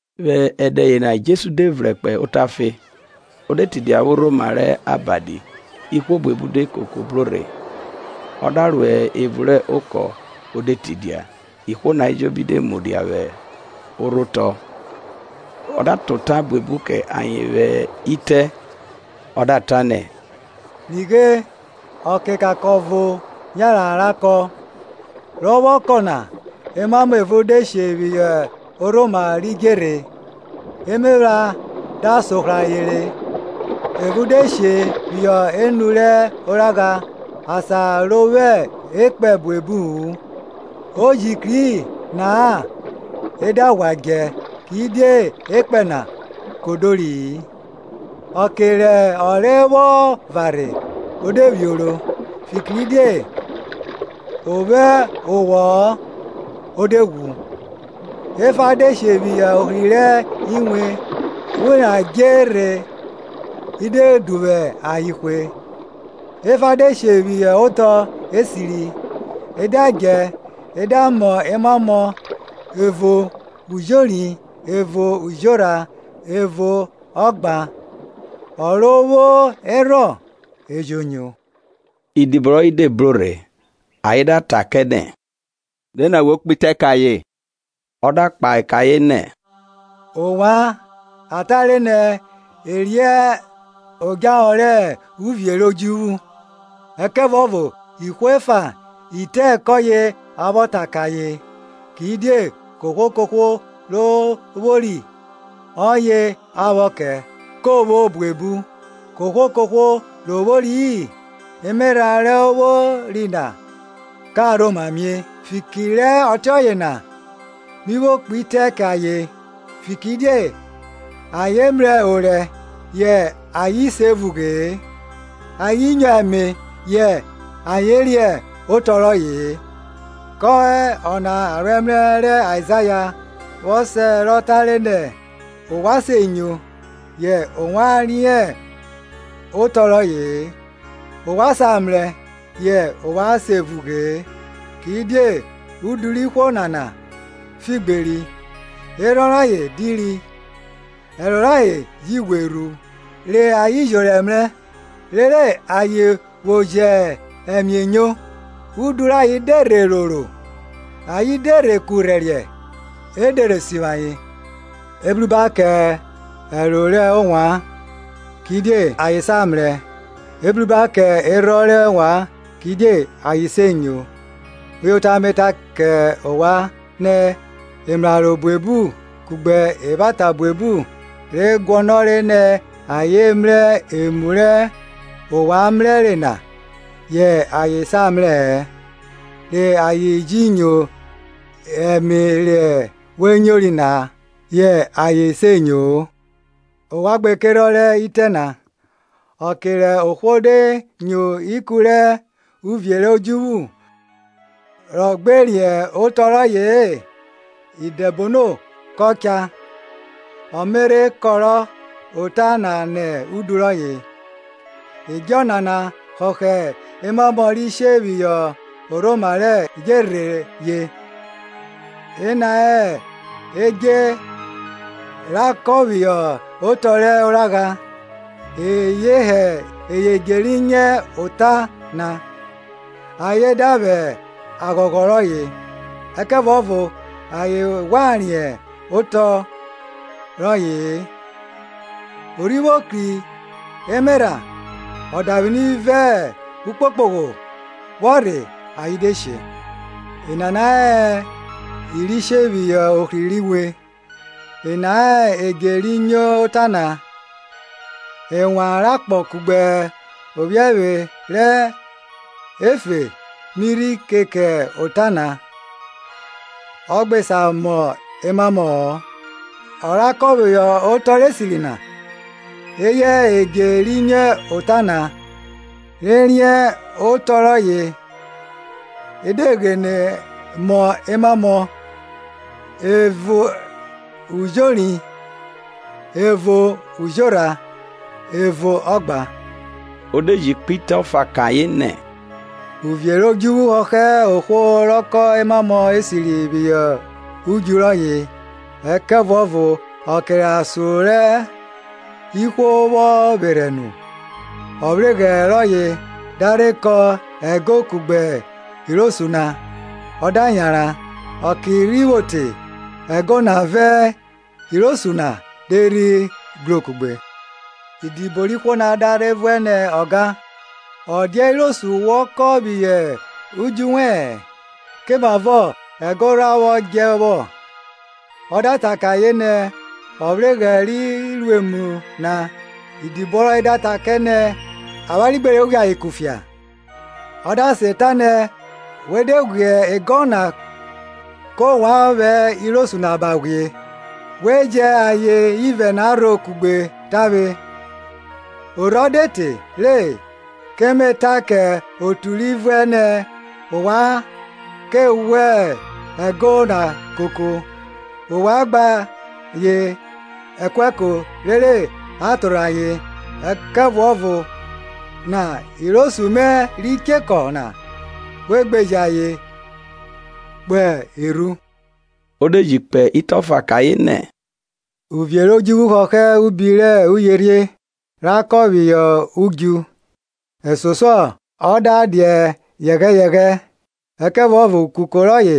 Vwẹ ẹdẹ yena Jesu de vrẹn kpo otafe, o de tidia vwẹ orhoma rẹ abadi. Ihwo buebu de koko bro rhe, ọ da ro evun rẹ okọ o de tidia; ihwo na ejobi de mudia vwẹ orhotọ. Ọ da ta ota buebu kẹ ayen vwẹ itẹ, ọ da ta nẹ, Nighe, ọkekankọn ọvo yanran ra kọn. Rọ vwọ kọn na, emamọ evo de she phihọ orhoma rẹ idjerhe, emephran da sohrọ ayen re. Ẹvo de she phihọ enu rẹ oragha, asan ro vwo ekpẹn buebu-u; o ji kri na-a e da ghwa djẹ, kidie ekpẹn na kodori-i; Ọke rẹ ọnre vwọ varhe, o de vwioro, fikiridie ọ vwo owọ-ọ o de ghwu. Ẹfa de she phihọ ohri rẹ inwe; inwe na dje rhe i de duvwu ayen hwe. Ẹfa de she phihọ otọ esiri, e da djẹ e da mọ emamọ, evo ujori, evo ujorha, evo ọgban. Ọ ro vwo erhọn, e jo nyo. Idibo rọye de bro rhe, ayen da ta kẹ nẹ, Die nẹrhẹ owẹ kpe itẹ kẹ ayen? Ọ da kpahe kẹ ayen nẹ, Ovwan a tare nẹ e riẹn odjahọ rẹ uvie rẹ odjuvwu, ẹkẹvuọvo ihwo efa itẹ kọye a vwọ ta kẹ ayen. Kidie kohwo kohwo ro vwori, ọye a vwọ kẹ, ko vwo buebu, kohwo kohwo ro vwori-i, emerha ro vwori na ka rhoma mie. Fiki rẹ ọtiọye na mi vwo kpe itẹ kẹ ayen, fikiridie ayen mrẹ orẹ yẹ ayen se vughe-e, ayen nyo ẹme yẹ ayen riẹn otọ rọye-e. Kẹ ọna aroẹmrẹ rẹ Aizaya vwọ sẹ rọ tare nẹ, Ovwan se nyo, yẹ ovwan riẹn otọ rọye-e, Ovwan sa mrẹ, yẹ ovwan se vughe-e. Kidie udu rẹ ihwo nana figberi, Erhọn rayen diri; Ẹro rayen ji ghwe rhu; Re ayen jẹ orẹ ẹmrẹ, Rere ayen vwo jẹ ẹme enyo; Udu rayen de rhe roro; Ayen de rhe kurhẹriẹ, E de rhe sivwi ayen. Ebruba kẹ ẹro rẹ ovwan, kidie ayen sa mrẹ; ebruba kẹ erhọn rẹ ovwan, kidie ayen se nyo. Uyota me ta kẹ ovwan nẹ, emraro buebu kugbe evwata buebu re guọnọre nẹ ayen mrẹ emu rẹ ovwan mrẹre na, yẹ ayen sa mrẹ-ẹ; re ayen ji nyo obo rẹ ovwan nyori na, yẹ ayen se nyo-o. Ovwan gbe kerhọn rẹ itẹ na. Ọke rẹ ohwo de nyo ikun rẹ uvie rẹ odjuvwu rọ gbe riẹn otọ rọye-e, idẹbono kọ cha, ọ me rhe kọrọ ota na nẹ udu rọye. Edje nana họhọ emamọ ri she phihọ orhoma rẹ idjerhe ye. Ena hẹ edje ra kọn phihọ otọ rẹ oragha, eye hẹ edje ri nyo ota na, ayen da vwẹ aghọghọ reyọ. Ẹkẹvuọvo ayen ghwa riẹn otọ rọye-e, o rhi vwo kri emerha, ọdavwini vẹ ukpokpogho vwọ rhe ayen de she. Enana hẹ i ri she phihọ ohri rẹ inwe, ena hẹ edje ri nyo ota na; ẹnwan rẹ akpọ kugbe ophiẹvwe rẹ efe mi rhi keke ota na, ọ gbe sa mọ emamọ-ọ. Ọ ra kọn phihọ otọ rẹ esiri na, eye hẹ edje ri nyo ota na, re riẹn otọ rọye, e da ghene mọ emamọ, evo ujori, evo ujorha, evo ọgban. O de ji kpe itẹ ọfa kẹ ayen nẹ, uvie rẹ odjuvwu hohọ ohwo rọ kọn emamọ esiri phihọ udju rọye. Ẹkẹvuọvo ọke rẹ asọn re ihwo vwọ vwerhẹ nu, ọvweghrẹ rọye da rhe kọn ego kugbe irosu na, ọ da yanran. Ọke rhi vwo te, ego na vẹ irosu na de rhi gro kugbe. Idibo rẹ ohwo na da rhe vuẹ nẹ, Ọga, ọ dia irosu wọ kọn phihọ udju wẹ-ẹn? Komavọ ego rha vwọ djẹ vwọ? O da ta kẹ ayen nẹ, Ọvweghrẹ ri ru emu na. Idibo rọye da ta kẹ nẹ, Avwanre gbe re ghwie ayen kufia? Ọ da sen ta nẹ, we de ghwie ego na kẹ ovwan vwẹ irosu na ba ghwie. We jẹn ayen ivẹ na rho kugbe tavwe. Orhọ de te re, ke me ta kẹ otu ri vuẹ nẹ, Ovwan ka ghwẹ ego na koko, wa gba ayen ẹkuẹko rere a torhẹ ayen; ẹkẹvuọvo irosu mẹ ri chekọ na we gbeje ayen kpo erhu. O de ji kpe itẹ ọfa kẹ ayen nẹ, Uvie rẹ odjuvwu họhọ ubi rẹ uyerhie ra kọn phihọ udju; Ẹsosuọ o da dia yẹyẹghẹ; ẹkẹvuọvo ukuko rọye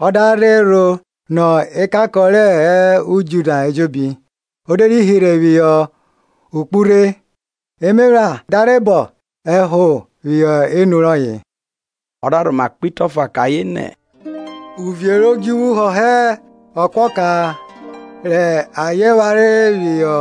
ọ da rhe rho nọ ekankọn re hẹ udju na ejobi, o de rhi hirhe phihọ okpurhe, emephran da rhe bọn ẹho phihọ enu rọye. Ọ da rhoma kpe itẹ ọfa kẹ ayen nẹ, Uvie rẹ odjuvwu họhọ ekuọka rẹ aye phare phihọ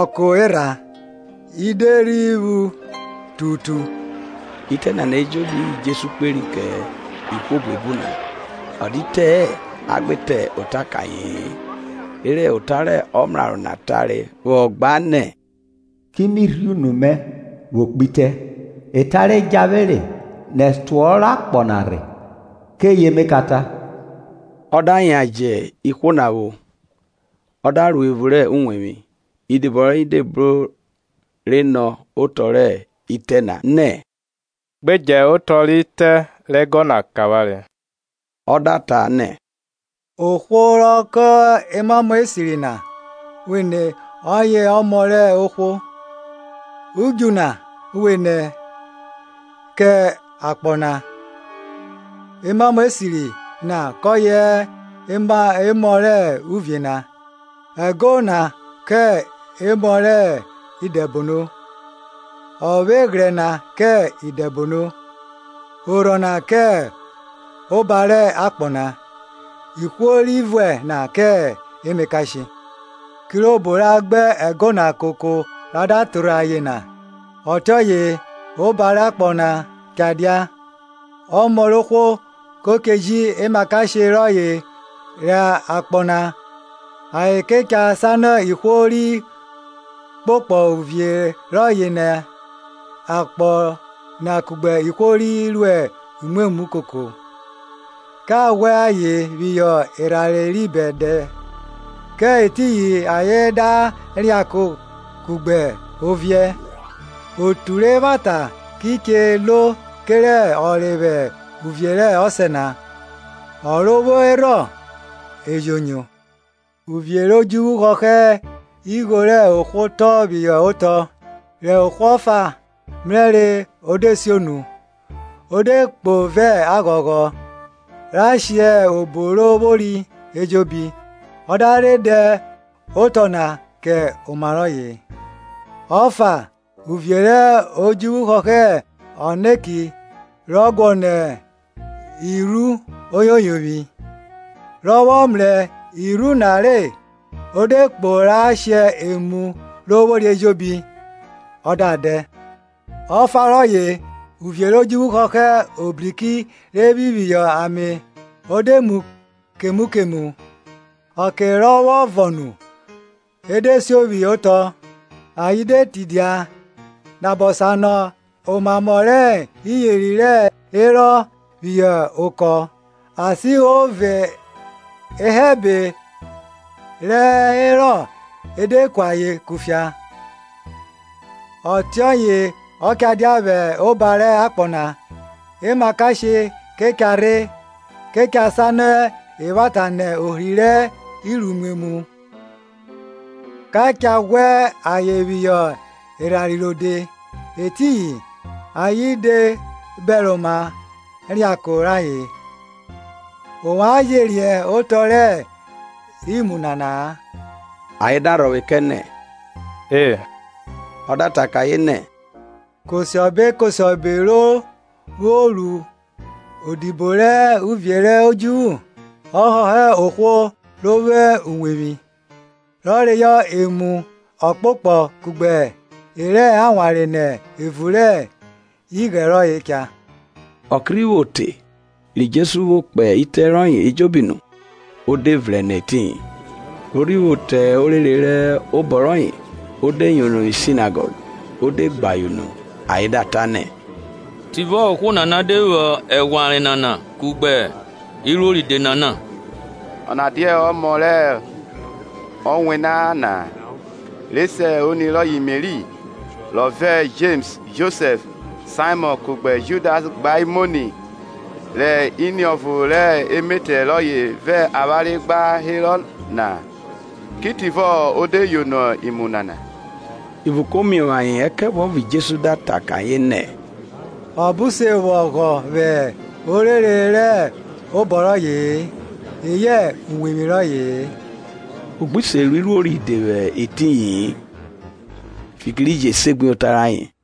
ọko erha, i de rhi phu tututu. Itẹ nana ejobi eye Jesu kperi kẹ ihwo buebu na, ọ dia itẹ-ẹ a gbe ta ota kẹ aye-en. Rere ota rẹ ọmraro na tare vwọ gba nẹ, Ki mi rhie unu mẹ vwo kpe itẹ; Eta re djahere nẹ ẹtuọhọ rẹ akpọ na rhe, keye me cha ta. Ọ da yan jẹ ihwo na vwo, ọ da ro evun rẹ uwevwi; idibo rọye de bro rhe rhe nọ otọ rẹ itẹ na nẹ, Gbe dje otọ rẹ ite rẹ ego na kẹ avwanre. Ọ da ta nẹ ohwo rọ kọn emamọ esiri na vwenẹ ọye Ọmọ rẹ ohwo; Udju na vwenẹ kẹ akpọ na; emamọ esiri na kọye hẹ emọ rẹ uvie na; ẹgo na kẹ emọ rẹ idẹbono; Ọvweghrẹ na kẹ idẹbono; orhọ na kẹ oba rẹ akpọ na, ihwo ri vuẹ na kẹ emakashe. Kirobo ra gba ego na koko ra da torhẹ ayen na, ọtiọye ọba rẹ akpọ na cha dia. Ọmọ rẹ ohwo ko che ji emakashe rọye ro akpọ na, ayen kẹ cha sanọ ihwo ri kpokpo uvie rọye nẹ akpọ na kugbe ihwo ri ruẹ imwemwu koko, Ka ghwẹ ayen phihọ erhanre ri bẹdẹ; kẹ etiyin ayen da reako kugbe oviẹ. Otu rẹ evwata ki che lo kerẹ ọnre vwẹ uvie rẹ Ọsẹ na. Ọ ro vwo erhọn e jo nyo. Uvie rẹ odjuvwu họhọ igho rẹ ohwo tọn phihọ otọ; rẹ ohwo ọfa mrẹre o de sionu; o de kpo vẹ aghọghọ ra shẹ obo ro vwori ejobi, ọ da rhe dẹ oto na kẹ oma rọye. Ọfa, uvie rẹ odjuvwu họhọ ọneki rọ guọnọ irhu oyoyovwi. Rọ vwọ mrẹ irhu na re, o de kpo ra she emu ro vwori ejobi, ọ da dẹ. Ọfa rọye, uvie rẹ odjuvwu họhọ ọbriki re phi phihọ ame, o de mu kemu kemu; Ọke rọ vwọ vọn nu, e de siọ phihọ otọ, ayen de tidia, nabọ sanọ omamọ rẹ iyeri re herọ phihọ okọ, asihọ vẹ ehẹbe re herọ e de ku ayen kufia. Ọtiọye ọ cha dia vwẹ oba rẹ akpọ na; emakashe ke cha rhe, ke cha sanọ evwata nẹ ohri rẹ iruimwemwu. Ka cha ghwẹ ayen phihọ erhanre rode; etiyin ayen da viẹ reako rayen. Ovwan je riẹn otọ rẹ imu nana-a? Ayen da rhọvwe kẹ nẹ, E. Ọ da ayen nẹ, kosiọbe kosiọbe re vwọ ru odibo rẹ uvie rẹ odjuvwu, ọ họhọ ohwo ro vwo uwevwi, rọ reyọ emu ọkpokpọ kugbe e rẹ awanre nẹ evun rẹ ighẹn rọye cha. Ọke rhi vwo te, ri Jesu vwo kpe itẹ rọye ejobi nu, o de vrẹn nẹ etiyin. Ro rhi vwo te orere rẹ obọ rọye, o de yono vwi senagọg, o de gbe ayen unu, ayen da ta nẹ, Tivọ ohwo nana de vwo eghwanre nana kugbe iruo ride nana. Ọna dia ọmọ rẹ ọwena na-a? re se oni rọye Meri? rọ vẹ Jems, Josẹf, Saimọn kugbe Judas gba hẹ imoni? Rẹ iniọvo rẹ emetẹ rọye vẹ avwanre gba herọ na-a? Ki tivọ o de yono imu nana? Ivun ko miovwo ayen. Ẹkẹvuọvo Jesu da ta kẹ ayen nẹ, Ọbo se vwo ọghọ vwẹ orere rẹ obọ roye-e, eyẹ uwevwi rọye-e. Ọ gbi se ru iruo ride vwẹ etiyi-in, fiki ri je segbuyota rayen.